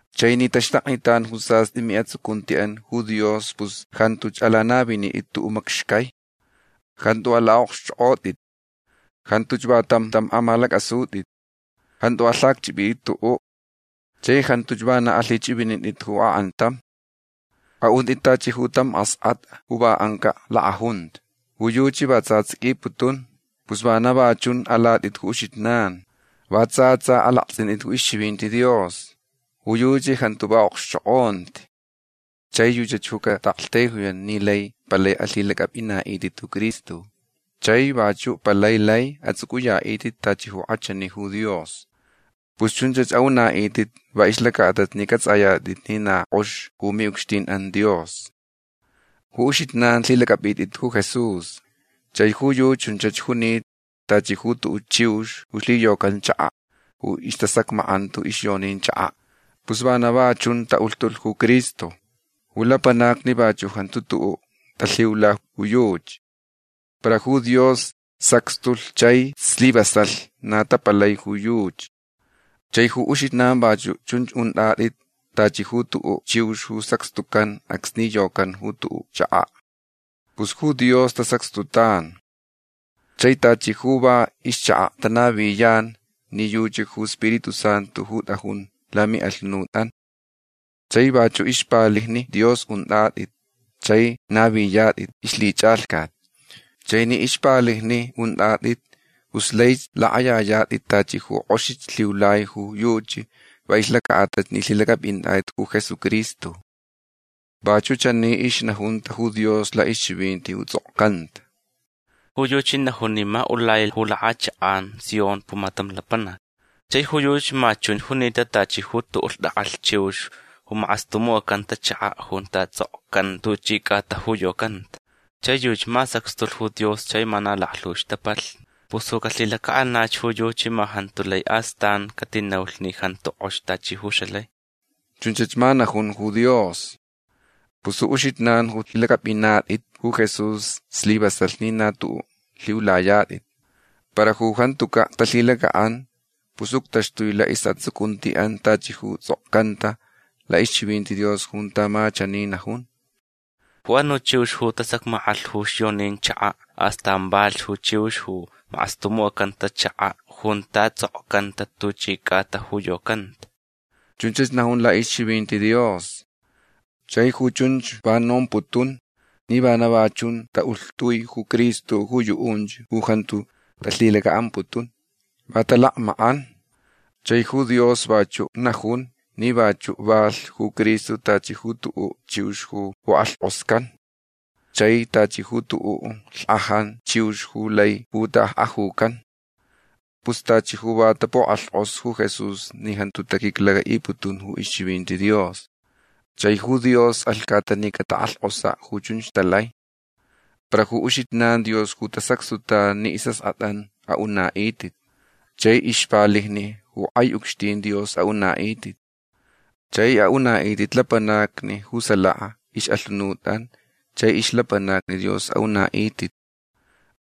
Chai ni taxtaknitan ju sast'i mi'atsucunti'an ju Dios pus jantuch alanavinit'it tu'u' macxcai. Jantu ala'okxch'ok'ot'it. Jantuch va tam tam amalac'asut'it. Jantu alhacch'ip'it'it tu'u'. Chai jantuch vana alhich'ivinint'it ju ak'antam. A'unt'it tachi ju tam ask'at'a ju va anca' lak'ajunta. Ju yuchi va tsa ts'iquiputun. Pus vana va chun alat'it ju uxijnan. Va tsa tsa alakts'int'it ju ixchivinti Dios. Ju yuchi jantu va a'okxchok'onti. Chai yuchach ju cata'aktaijuyan ni lai palai alhilac'ap'ina'it'it ju Cristo. Chai vachu' palai lai ats'uc'uya'it'it tachi ju k'achani ju Dios. Pus chunch a'una'it'it va ixlaca'atalh ni c'ats'ayat'it ni na k'ox ju mi'ucxtin'an Dios. Ju uxijnan lhilac'ap'it'it ju Jesús. Chai ju yuchi chunch junita tachi ju tu'u' chiux ju lhiyocan chaka' ju istasacmack'anta ju ixyonin chaka'. Pus vana va chunch ta'ulhtulh ju Cristo. Ju lapanacni vachu' jantu tu'u' talhiula ju yuchi. Para ju Dios sacxtulh chai slivasalh na tapalai ju yuchi. Chai ju uxijnan vachu' chunch unt'at'it tachi ju tu'u' chiux ju sacxtucan acsni yocan ju tu'u' chaka'. Pus ju Dios tasacxtutan. Chai tachi ju va ixchaka' tanaviyan ni yuchi ju Spiritu Santu ju t'ajun lami'alhunut'an. Chai vachu' ixpalijni Dios unt'at'it chai naviyat'it ixlhich'alhcat. Chai ni ixpalijni unt'at'it pus laich lak'ayayat'it tachi ju k'oxich lhiulai ju yuchi va ixlaca'atalh ni lhilac'ap'inat'it ju Jesucristo. Vachu' chani ixnajunta ju Dios la'ixchivinti ju ts'okcanta: Ju yuchi najun ni ma ulai ju lak'achak'an Sion pumatam lapanac. Chai ju yuchi ma chunch junita tachi ju tu'u' lhtak'alh chiux ju mak'astumuc'acanta chaka' junta ts'okcanta tuchi c'ata ju yocanta. Chai yuchi ma sacxtulh ju Dios chai ma na laklhu ixtapalhni. Pus ju calhilaca'anach ju yuchi ma jantu lai astan catinaulh ni jantu k'ox tachi ju xalai. Chunch ma najun ju Dios. Pus ju uxijnan ju lhilac'ap'inat'it ju Jesús slivasalh ni na tu'u' lhiulayat'it. Para ju jantuca' talhilaca'an pus uctaxtui la'is'atsucunti'an tachi ju ts'okcanta la'ixchivinti Dios junta ma chani najun: Ju anu' chiux ju tasacmack'alh ju ixyonin chaka' astan valhch ju chiux ju mak'astumuc'acanta chaka' junta ts'okcanta tuchi c'atach ju yocanta. Chunch najun la'ixchivinti Dios. Chai ju chunch va nomputun ni vana va chun ta'ulhtui ju Cristo ju yu'unch ju jantu talhilaca'amputun. Va talakmack'an. Chai ju Dios vachu' najun ni vachu' valh ju Cristo tachi ju tu'u' chiux ju puk'alhk'oscan chai tachi ju tu'u' lhkajani chiux ju lai puta'akk'ajucan. Pus tachi ju va tapuk'alhk'os ju Jesús ni jantu taquiclaca'iputun ju ixchivinti Dios. Chai ju Dios alhcata ni catak'alhk'osa' ju chunch talai. Para ju uxijnan Dios ju tasacxtutan ni is'ask'at'an a'una'it'it. Chai ixpalijni ju k'ai ucxtin Dios a'una'it'it. Chai a'una'it'it lapanacni ju salaka ix'alhunut'an chai ixlapanacni Dios a'una'it'it.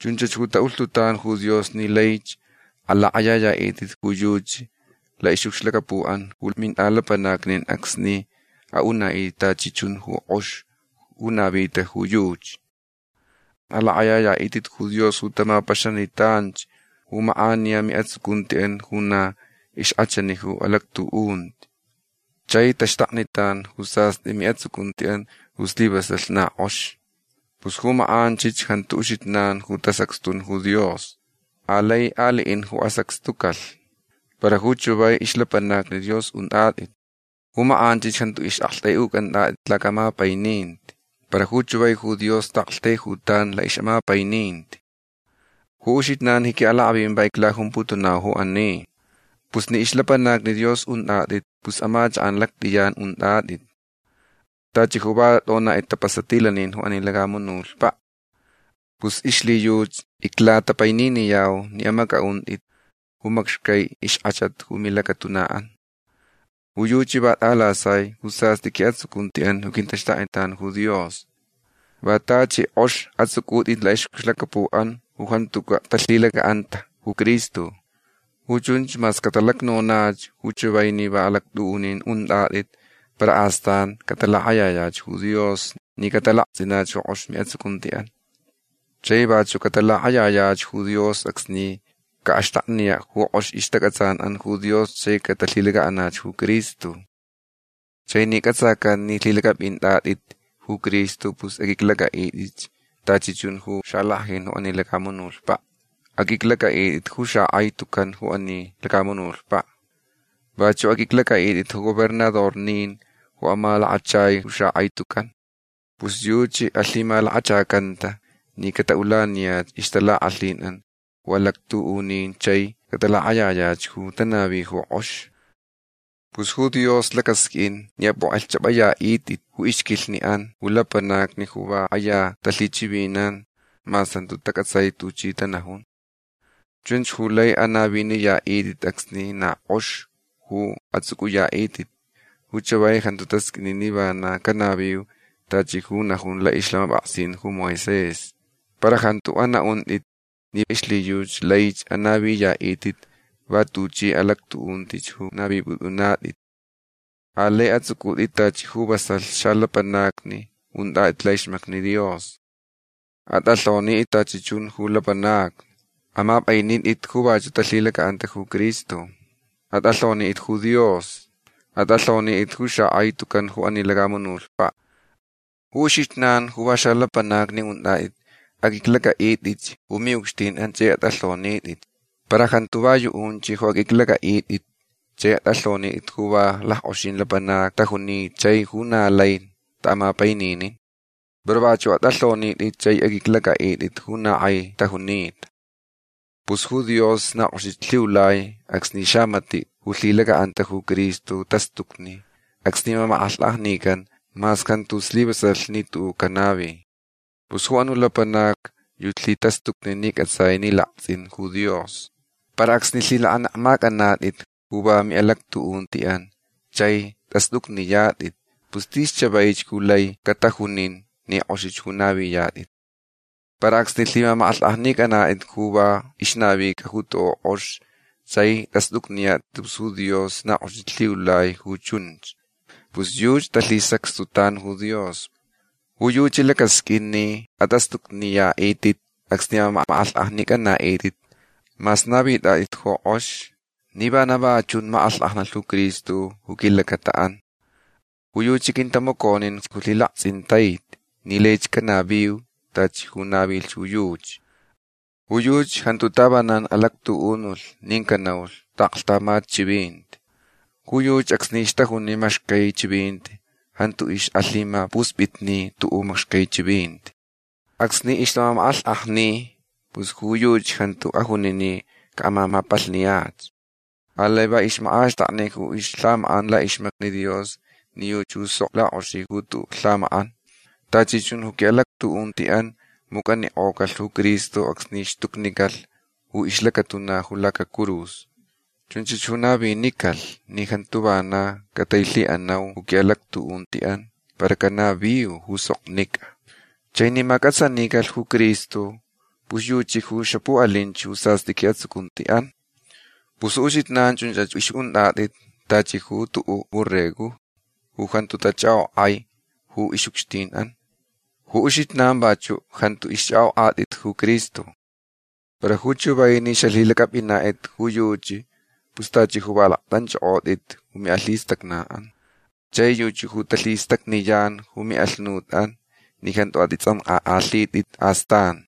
Chunch ju ta'ulhtutan ju Dios ni laich alak'ayaya'it'it ju yuchi la'ix'ucxlacapu'an ju mint'alapanacni'an acsni a'una'it'it tachi chun ju k'ox ju navita ju yuchi. Alak'ayaya'it'it ju Dios ju tamapaxanitanch ju mak'aniya mi'atsucunti'an ju na ixk'achani ju alactu'unti. Chai taxtaknitan ju sast'i mi'atsucunti'an ju slivasalh na k'ox. Pus ju mak'anchich jantu uxijnan ju tasacxtun ju Dios. Alai ali'in ju asacxtucalh. Para ju chavai ixlapanacni Dios unt'at'it. Ju mak'anch jantu ix'akt'ai'uc'ant'at'it laca'amapaininti. Para ju chavai ju Dios ta'aktaijutan la'ix'amapaininti. Ju uxijnan ji qui'alak'avin va iclajumputunau ju ani. Pus ni ixlapanacni Dios unt'at'it pus amachak'an lact'iyan unt'at'it. Tachi ju va t'onat'it tapasatilanin ju ani lacamunutpa'. Pus ixlhiyuchi iclatapaininiyau ni amac'a'unt'it ju macxcai ixk'achat ju milacatuna'an. Ju yuchi va t'alasai ju sast'i qui'atsucunti'an ju quintaxtaknitan ju Dios. Va tachi k'ox ats'uc'ut'it la'ix'ucxlacapu'an ju jantuca' talhilaca'anta ju Cristo. Ju chunch mas catalacnonach ju chavai ni va alactu'unin unt'at'it para astanch catalak'ayayach ju Dios ni catalakts'inach ju k'ox mi'atsucunti'an. Chai vachu' catalak'ayayach ju Dios acsni ca'alacxtakniya' ju k'ox ixtac'atsan'an ju Dios chai catalhilaca'anach ju Cristo. Chai ni c'atsacan ni lhilac'ap'int'at'it ju Cristo pus aq'uiclac'a'it'itch tachi chun ju xalack'ajin ju ani lacamunutpa'. Aq'uiclac'a'it'it ju xak'ai tucan ju ani lacamunutpa'. Vachu' aq'uiclac'a'it'it ju gobernadornin ju amalakachai ju xak'ai tucan. Pus yuchi alhimalakachacanta ni cata'ulaniyach ixtalak'alhin'an ju alactu'unin chai catalak'ayayach ju tanavich ju k'ox. Pus ju Dios lacasq'uin ni ap'uk'elhch'ap'aya'it'it ju ixquilhni'an ju lapanacni ju va k'aya talhichivinan mas jantu tac'atsai tuchi tanajun. Chunch ju lai anaviniya'it'it acsni na k'ox ju ats'uc'uya'it'it. Ju chavai jantu tasq'uini ni vana canaviu tachi ju najun la'ixlhamap'aksin ju Moisés. Para jantu ana'unt'it ni ixlhiyuchi laich anaviya'it'it va tuchi alactu'unti ju navip'ut'unat'it. Alai ats'uc'ut'itch tachi ju vasalh xalapanacni unt'at'it la'ixmacni Dios. At'alhonit'it tachi chun ju lapanacni. Amap'ainit'it ju vachu' talhilaca'anta ju Cristo. At'alhonit'it ju Dios. At'alhonit'it ju xak'ai tucan ju ani lacamunutpa'. Ju uxijnan ju va xalapanacni unt'at'it aq'uiclac'a'it'itch ju mi'ucxtin'an chai at'alhonit'it. Para jantu va yu'unch ju aq'uiclac'a'it'it chai at'alhonit'it ju va lack'oxin lapanacni tajunita chai ju na lai ta'amapaininin. Para vachu' at'alhonit'it chai aq'uiclac'a'it'it ju na k'ai tajunita. Pus ju Dios na k'oxich lhiulai acsni xamati' ju lhilaca'anta ju Cristo tastucni acsni mamak'alhk'ajnican mas jantu slivasalh ni tu'u' canavi. Pus ju anu' lapanac yuchi lhitastucni ni c'atsai ni lakts'inch ju Dios. Para acsni lhilak'anekmac'anat'it ju va mi'alactu'unti'an chai t'ast'ucniyat'it pus tis chavaich ju lai catajunin ni k'oxich ju naviyat'it. Para acsni lhimamak'alhk'ajnic'anat'it ju va ixnavica ju tu'u' k'ox chai t'ast'ucniyat'it pus ju Dios na k'oxich lhiulai ju chunch. Pus yuchi talhisacxtutan ju Dios. Ju yuchi lacasq'uin ni at'ast'ucniya'it'it acsni amamak'alhk'ajnic'ana'it'it mas navit'at'it ju k'ox ni vana va chun mak'alhk'ajnalh ju Cristo ju quilacata'an. Ju yuchi quintamaconinch ju lhilakts'intaiti ni laich canaviu tachi ju navilh ju yuchi. Ju yuchi jantu tavanan alactu'unulh nin canaulh ta'aklhtamat chivinti. Ju yuchi acsni ixtajuni macxcai chivinti jantu ix'alhimapusp'itni tu'u' macxcai chivinti. Acsni ixtamamak'alhk'ajni pus ju yuchi jantu ajuni ni ca'amamap'alhniyach. Alai va ixmak'axtakni ju ixlhamak'an la'ixmacni Dios ni yuchi ju sok lak'oxi ju tu'u' lhamak'an. Tachi chun ju qui'alactu'unti'an muc'anik'ocalh ju Cristo acsni xtucnicalh ju ixlacatuna ju lacacurus. Chunch ju navinicalh ni jantu vana catailhi'anau ju qui'alactu'unti'an para canaviu ju soknic'a. Chai ni mac'atsanicalh ju Cristo pus yuchi ju xapu'alinch ju sast'i qui'atsucunti'an. Pus ju uxijnan chunch ix'unt'at'it tachi ju tu'u' borregojni ju jantu tach'ak'ok'ai ju ix'ucxtin'an. Ju uxijnan vachu' jantu ixch'ak'ok'at'it ju Cristo. Para ju chavai ni xalhilac'ap'inat'it ju yuchi pus tachi ju va lakt'anch'ok'ot'it ju mi'alhistacna'an. Chai yuchi ju talhistacniyan ju mi'alhunut'an ni jantu at'its'ank'ak'alhit'it astan.